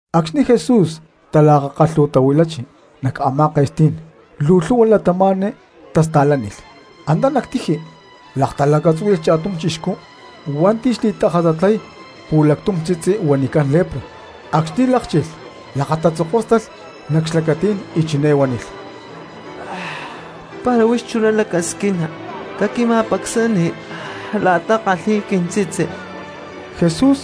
Acxni̠ Jesús talakakalhu̠tahuilachi nac a̠má ke̠stí̠n luu lhu̠hua cristianos tasta̠lánilh. Antá nac tiji laktalacatzúhui̠lh cha̠tum chixcú hua̠nti̠ xli̠tajatatlay pu̠lactum tzitzi huanicán lepra. Acxni̠ lákchilh lakatatzokóstalh nac xlacatí̠n y chiné huánilh: —Para huix chuná lacasquina caquima̠pacsani la̠ta ckalhi̠y quintzitzi. Jesús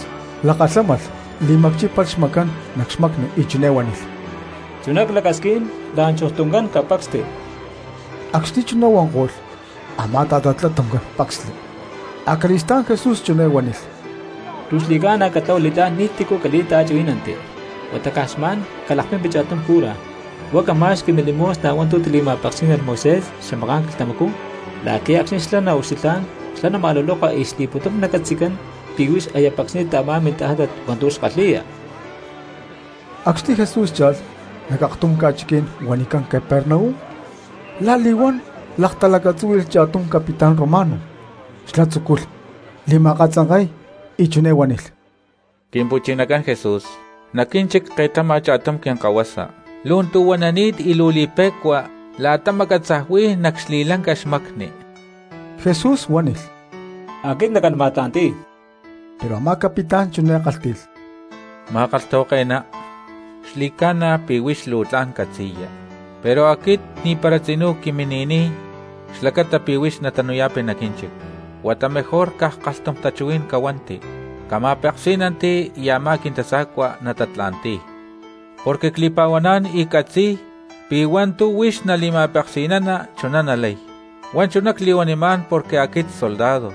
lakalhámalh li̠macchípalh xmacán nac xmacni y chiné huánilh: —Chuná clacasquín, la̠nchujtuncán capacsti. Acxni̠ chuná huanko̠lh a̠má ta̠tatlá tuncán pacsli. Acali̠stá̠n Jesús chiné huánilh: —Luu xli̠ca̠na catlahua li̠tlá̠n ni̠tícu cali̠ta̠chuhuí̠nanti. Huata caj xma̠n calakpimpi cha̠tum cura, huá cama̠xqui milimosna hua̠ntu̠ tili̠ma̠peksí̠nalh Moisés xamaká̠n quilhtamacú la̠qui̠ acxni̠ xlá naucxilhá̠n xlá nama̠luloka y xli̠pu̠tum nacatzi̠cán pi̠ huix aya pacsni̠ta a̠má mintajátat hua̠ntu̠ xkalhi̠ya. Acxni̠ Jesús cha̠lh nac aktum ca̠chiquí̠n huanicán Capernaum la̠li̠huán laktalacatzúhui̠lh cha̠tum capitán romano; xlá tzúculh li̠ma̠katzanke̠y, y chiné huánilh: —Quimpu̠chinacán Jesús, nac quínchic ke̠tama cha̠tum quintasa̠cua lu̠ntu̠huanani̠t y luu li̠pe̠cua la̠ta macatzaj huí nac xli̠lanca xmacni. Jesús huánilh: —Aquit nacán ma̠tla̠nti̠y. Pero a̠má capitán chiné kálhti̠lh: —Ma̠kalhtahuake̠ná, xli̠ca̠na pi̠ huix luu tla̠n catzi̠ya, pero aquit ni̠para tzinú quimini̠niy xlacata pi̠ huix natanu̠yá̠pi nac quínchic. Huata mejor caj kalhtum tachuhuí̠n cahuanti cama̠peksí̠nanti y a̠má quintasa̠cua natatla̠ntí̠y, porque cli̠pa̠huaná̠n y ccatzi̠y pi̠ hua̠ntu̠ huix nali̠ma̠peksi̠nana chuná nalay. Huá chuná cli̠huanimá̠n porque aquit soldado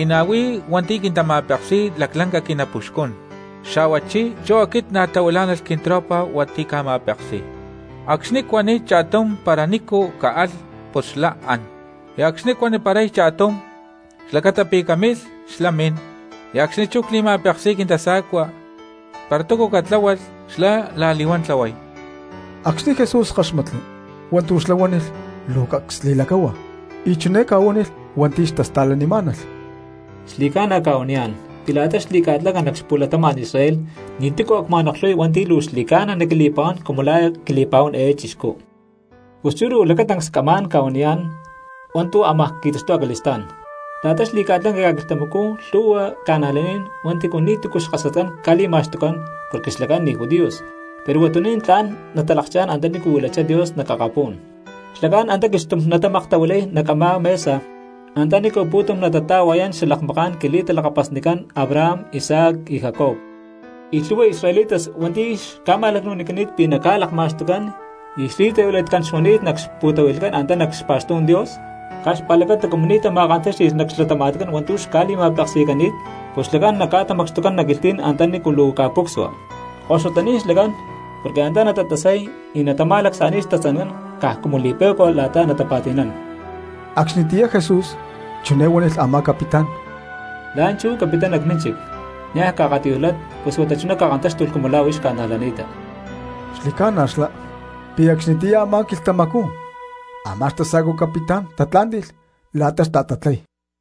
y na̠ huí hua̠nti̠ quintama̠peksi̠y laclanca quinapuxcún. Xa̠huachí chú aquit na̠ tahuilá̠nalh quintropa hua̠nti̠ cca̠ma̠peksi̠y; acxni̠ cuaniy cha̠tum para nícu caalh pus xlá án, y acxni̠ cuaniparay cha̠tum xlacata pi̠ camilh xlá namín; y acxni̠ chú cli̠ma̠peksi̠y quintasa̠cua para túcu catláhualh xlá la̠li̠huán tlahuay. Acxni̠ Jesús káxmatli hua̠ntu̠ xlá huánilh luu cacs li̠lacahua y chiné ca̠huánilh hua̠nti̠ xtasta̠lanimá̠nalh: —Xli̠ca̠na cca̠huaniyá̠n pi̠ la̠ta xli̠ca̠lanca nac xapu̠latama̠n Israel ni̠tícu a̠ cma̠noklhuy hua̠nti̠ luu xli̠ca̠na naquili̠pa̠huán cumu la̠ quili̠pa̠huán eé chixcú. Pus chú luu lacatancs camá̠n ca̠huaniyá̠n hua̠ntu̠ amaj qui̠taxtuy acali̠stá̠n: la̠ta xli̠ca̠lanca ca̠quilhtamacú lhu̠hua cristianos hua̠nti̠ ni̠tu̠cu xkasatcán ca̠li̠ma̠xtucán porque xlacán ni̠ judíos, pero huatuní̠n tla̠n natalakchá̠n antanícu huilachá Dios nac akapú̠n; xlacán antá quilhxtum natamaktahuilay nac a̠má mesa antanícu pu̠tum natata̠hua̠yán xalakmaká̠n quili̠talakapasnicán Abraham, Isaac y Jacob. Y lhu̠hua cristianos israelitas hua̠nti̠ xca̠ma̠lacnu̠nicani̠t pi̠ naca̠lakma̠xtucán y xli̠tahuilatcán xuani̠t nac xpu̠tahui̠lhcán antá nac xpa̠xtú̠n Dios, caj xpa̠lacata cumu ni̠ tama̠kantáxti̠lh nac xlatama̠tcán hua̠ntu̠ xca̠li̠ma̠peksi̠cani̠t, pus xlacán naca̠tamacxtucán nac quilhtí̠n antanícu luu ca̠púcsua. ¡Koxutaní̠n xlacán, porque antá natatasay y natama̠lacsa̠ni̠y xtatzancán caj cumu li̠pe̠cua la̠ta natapa̠ti̠nán! Acxnitiyá Jesús chiné huánilh a̠má capitán: —La̠nchú capittá nac mínchic, niaj caakatiyújlat pus huata chuná cakantáxtulh cumu la̠ huix ca̠najlani̠ta. Xli̠ca̠na xlá pi̠ acxnitiyá a̠má quilhtamacú a̠má xtasa̠cua capitán tatlá̠nti̠lh la̠ta xta̠tatlay.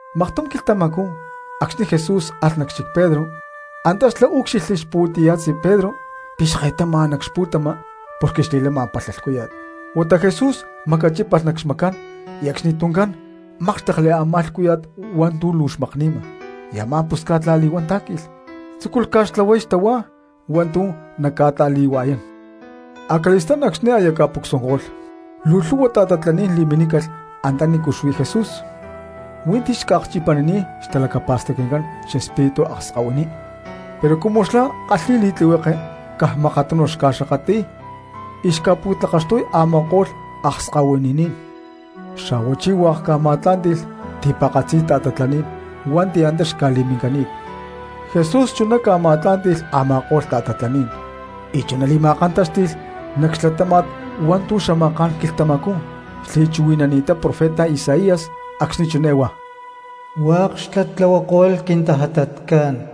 Maktum quilhtamacú acxni̠ Jesús alh nac xchic Pedro antá xlá úcxilhli xpu̠tiya̠tzi Pedro pi̠ xke̠tama nac xpu̠tama porque xli̠lama palha lhcúya̠t. Huata Jesús macachípalh nac xmacán y acxnituncán mákxtekli a̠má lhcúya̠t hua̠ntu̠ luu xmakni̠ma; y a̠má pusca̠t la̠li̠huán tá̠qui̠lh, tzúculh ca̠xtlahuay xtahuá hua̠ntu̠ naca̠ta̠li̠hua̠yán. Acali̠stá̠n acxni̠ aya ca̠pucsuanko̠lh, luu lhu̠hua ta̠tatlaní̠n li̠minícalh antanícu xuí Jesús; huí ti̠ xca̠akchipanini̠t xtalacapa̠stacnicán xespíritu akskahuiní pero cumu xlá kalhi̠y li̠tlihueke caj makatunu xca̠xakatli̠y y xca̠pu̠tlakaxtuy a̠ma̠ko̠lh akskahuininí̠n. Xa̠huachí hua̠k ca̠ma̠tlá̠nti̠lh ti̠pa̠katzi ta̠tatlaní̠n hua̠nti̠ antá xca̠li̠minicani̠t. Jesús chuná ca̠ma̠tlá̠nti̠lh a̠ma̠ko̠lh ta̠tatlaní̠n y chuná li̠ma̠kantáxti̠lh nac xlatáma̠t hua̠ntu̠ xamaká̠n quilhtamacú xli̠chuhui̠nani̠ttá profeta Isaías acxni̠ chiné huá: “Hua̠k xlá tlahuako̠lh quintajatatcán.”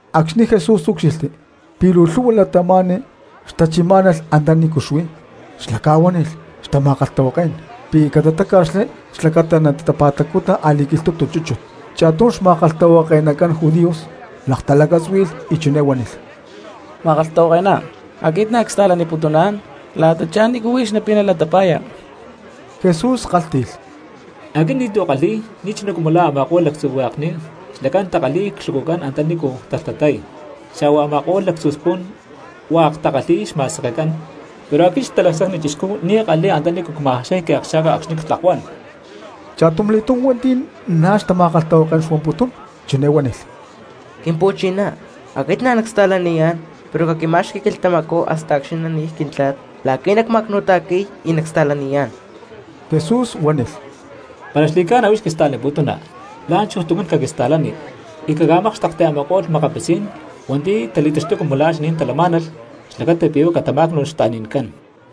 Acxni̠ Jesús úcxilhli pi̠ luu lhu̠hua cristianos xtachimá̠malh antanícu xuí xlá, ca̠huánilh xtama̠kalhtahuaké̠n pi̠ catatáca̠xli xlacata natapa̠tacuta a̠li̠quilhtu̠tu chúchut. Cha̠tum xma̠kalhtahuake̠nacán judíos laktalacatzúhui̠lh y chiné huánilh: —Ma̠kalhtahuake̠ná, aquit na̠ csta̠laniputuná̠n la̠tachá nícu huix napina latapa̠ya. Jesús kálhti̠lh: —Aquit ni̠tu̠ ckalhi̠y, ni̠chuná cumu la̠ a̠ma̠ko̠lh lactzu hue̠kni xlacán takalhi̠y clhucucán antanícu talhtatay, xa̠huá a̠ma̠ko̠lh lactzu spu̠n hua̠k takalhi̠y xma̠sekecán; pero aquit Xatalacsacni Chixcú ni̠ ckalhi̠y antanícu cma̠jaxay quiakxa̠ka acxni̠ ctlakuán. Cha̠tumli̠túm hua̠nti̠ na̠ xtama̠kalhtahuaké̠n xuamputún chiné huánilh: —Quimpu̠chiná, aquit na̠ nacsta̠laniyá̠n pero caquintima̠xqui quilhtamacú hasta acxni̠ nani̠y quintla̠t la̠qui̠ nacma̠cnu̠ta̠qui̠y y nacsta̠laniyá̠n. Jesús huánilh: —Para xli̠ca̠na huix quista̠laniputuna, la̠nchujtuncán caquista̠lani y caca̠mákxtekti a̠ma̠ko̠lh makapitzí̠n cristianos hua̠nti̠ tali̠taxtuy cumu la̠ xaní̠n talamá̠nalh xlacata pi̠ huá catamá̠cnu̠lh xta̠ni̠ncán.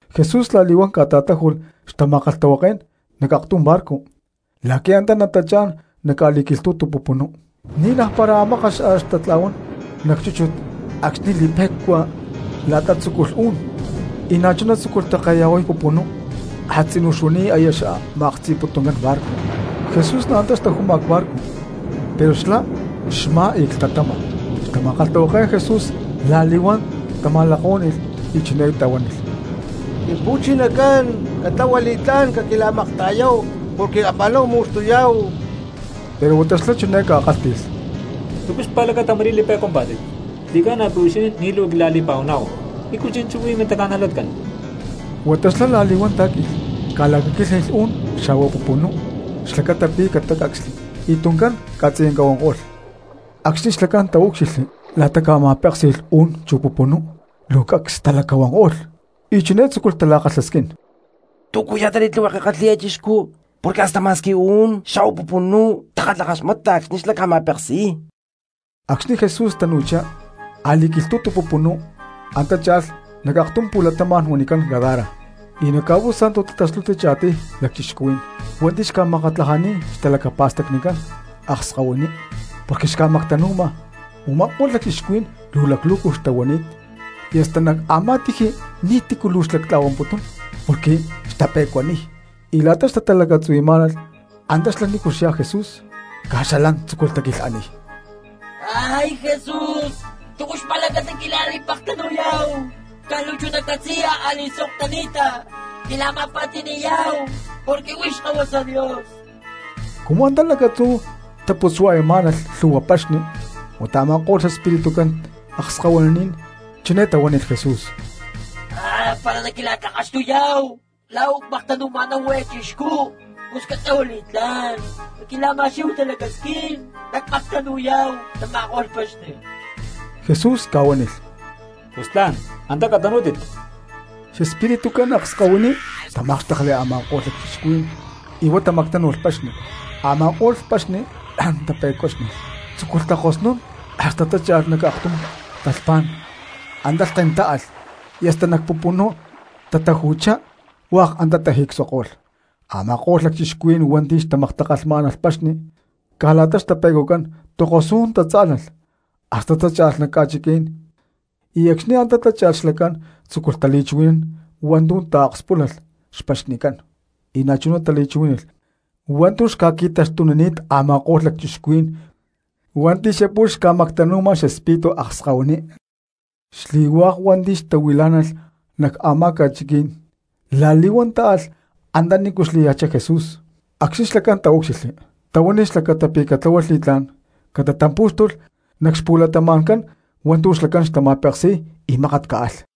Jesús la̠li̠huán ca̠ta̠táju̠lh xtama̠kalhtahuaké̠n nac aktum barco la̠qui̠ antá natachá̠n nac a̠li̠quilhtú̠tu pupunú. Ni̠ naj para mákat a̠ xtatla̠huán nac chúchut acxni̠ li̠pe̠cua la̠ta tzúculh u̠nún y na̠chuná tzúculh ta̠keya̠huay pupunú a̠tzinú xuani̠t aya xma̠ktzi̠putuncán barco. Jesús na̠ antá xtaju̠ma cbarco pero xlá xmá y clhtatama. Xtama̠kalhtahuaké̠n Jesús la̠li̠huán tama̠lakahuáni̠lh y chiné tahuánilh: —Quimpu̠chinacán, ¡catlahua li̠tlá̠n, caquila̠makta̠yáhu porque la̠nchú ama̠náhu mu̠xtuyá̠hu! Pero huata xlá chiné ca̠kálhti̠lh: —¿Túcu xpa̠lacata ma̠rí li̠pe̠cuampá̠tit? ¡Xli̠ca̠na pi̠ huixinín ni̠ luu quila̠li̠pa̠huaná̠hu! ¿Nícu chi̠nchú huí mintaca̠najlatcán? Huata xlá la̠li̠huán tá̠qui̠lh, ca̠lacaquílhni̠lh uú̠n xa̠hua pupunú xlacata pi̠ catatácacsli, y tuncán ca̠tziyanca huanko̠lh. Acxni̠ xlacán taúcxilhli la̠ta ca̠ma̠péksi̠lh uú̠n chu pupunú luu cacs talacahuanko̠lh y chiné tzúculh tala̠kalhasquín: —¿Túcu ya̠ta li̠tlihueke kalhi̠y eé chixcú, porque hasta ma̠squi uú̠n xa̠hua pupunú takalhakaxmata acxni xlá ca̠ma̠peksi̠y? Acxni̠ Jesús tacutchá a̠li̠quilhtu̠tu pupunú antá cha̠lh nac aktum pu̠latama̠n huanicán Gadara, y nac ca̠pú̠sa̠ntu tataxtuchi cha̠tiy lacchixcuhuí̠n hua̠nti̠ xca̠makatlajani̠t xtalacapa̠stacnicán akskahuiní porque xca̠mactanu̠ma. Uma̠kó̠lh lacchixcuhuí̠n luu laclu̠cu xtahuani̠t y hasta nac a̠má tiji ni̠tícu luu xlactla̠huán porque xtape̠cuaniy. Y la̠ta xtatalacatzuhui̠má̠nalh antá xlá nícu xyá Jesús, caj xalán tzúculh taquilhaniy: —¡Jesús! ¿Túcu xpa̠lacata quila̠li̠pektanu̠yá̠hu? Caj luu chuná catzi̠ya a̠li̠sok tani̠ta quila̠ma̠pa̠ti̠ni̠yá̠hu porque huix Xkahuasa Dios. Cumu antá lacatzú xtaputzua̠yamá̠nalh lhu̠hua paxni huata a̠ma̠ko̠lh xespiritucán akskahuiní chiné tahuánilh Jesús: —Para naquila̠tlakaxtuyá̠hu la̠ u̠cmactanu̠ma̠náhu eé chixcú, pus luu catlahua li̠tlá̠n caquila̠ma̠xquí̠hu talacasquín nacca̠mactanu̠yá̠hu tama̠ko̠lh paxni. Jesús ca̠huánilh: —Pus tla̠n, antá catanú̠tit. Xespiritucán akskahuiní tamákxtekli a̠ma̠ko̠lh lacchixcuhuí̠n y huá tamactánu̠lh paxni. Ama̠ko̠lh paxni la̠n tape̠cuáxni̠lh, tzúculh takosnún hasta tácha̠lh nac aktum talhpá̠n, antá lhken táalh y hasta nac pupunú tataju̠chá, hua̠k antá tajicsuanko̠lh. Ama̠ko̠lh lacchixcuhuí̠n hua̠nti̠ xtamaktakalhmá̠nalh paxni, caj la̠ta xtape̠cuacán tokosú̠n tatzá̠lalh hasta tácha̠lh nac ca̠chiquí̠n; y acxni̠ antá tácha̠lh xlacán tzúculh tali̠chuhui̠nán hua̠ntu̠ taakspúlalh xpaxnicán, y na̠chuná tali̠chuhuí̠nalh hua̠ntu̠ xca̠qui̠taxtunini̠t a̠ma̠ko̠lh lacchixcuhuí̠n hua̠nti̠ xapu̠lh xca̠mactanu̠ma xespíritu akskahuiní. Xli̠pu̠tum cristianos hua̠nti̠ xtahuilá̠nalh nac a̠má ca̠chiquí̠n la̠li̠huán ta̠lh anta nícu xlaya̠chá Jesús. Acxni xlacán taúcxilhli tahuánilh xlacata pi̠ catláhualh li̠tlá̠n catatampú̠xtulh nac xpu̠latama̠ncán hua̠ntu̠ xlacán xtama̠peksi̠y y mákat caalh.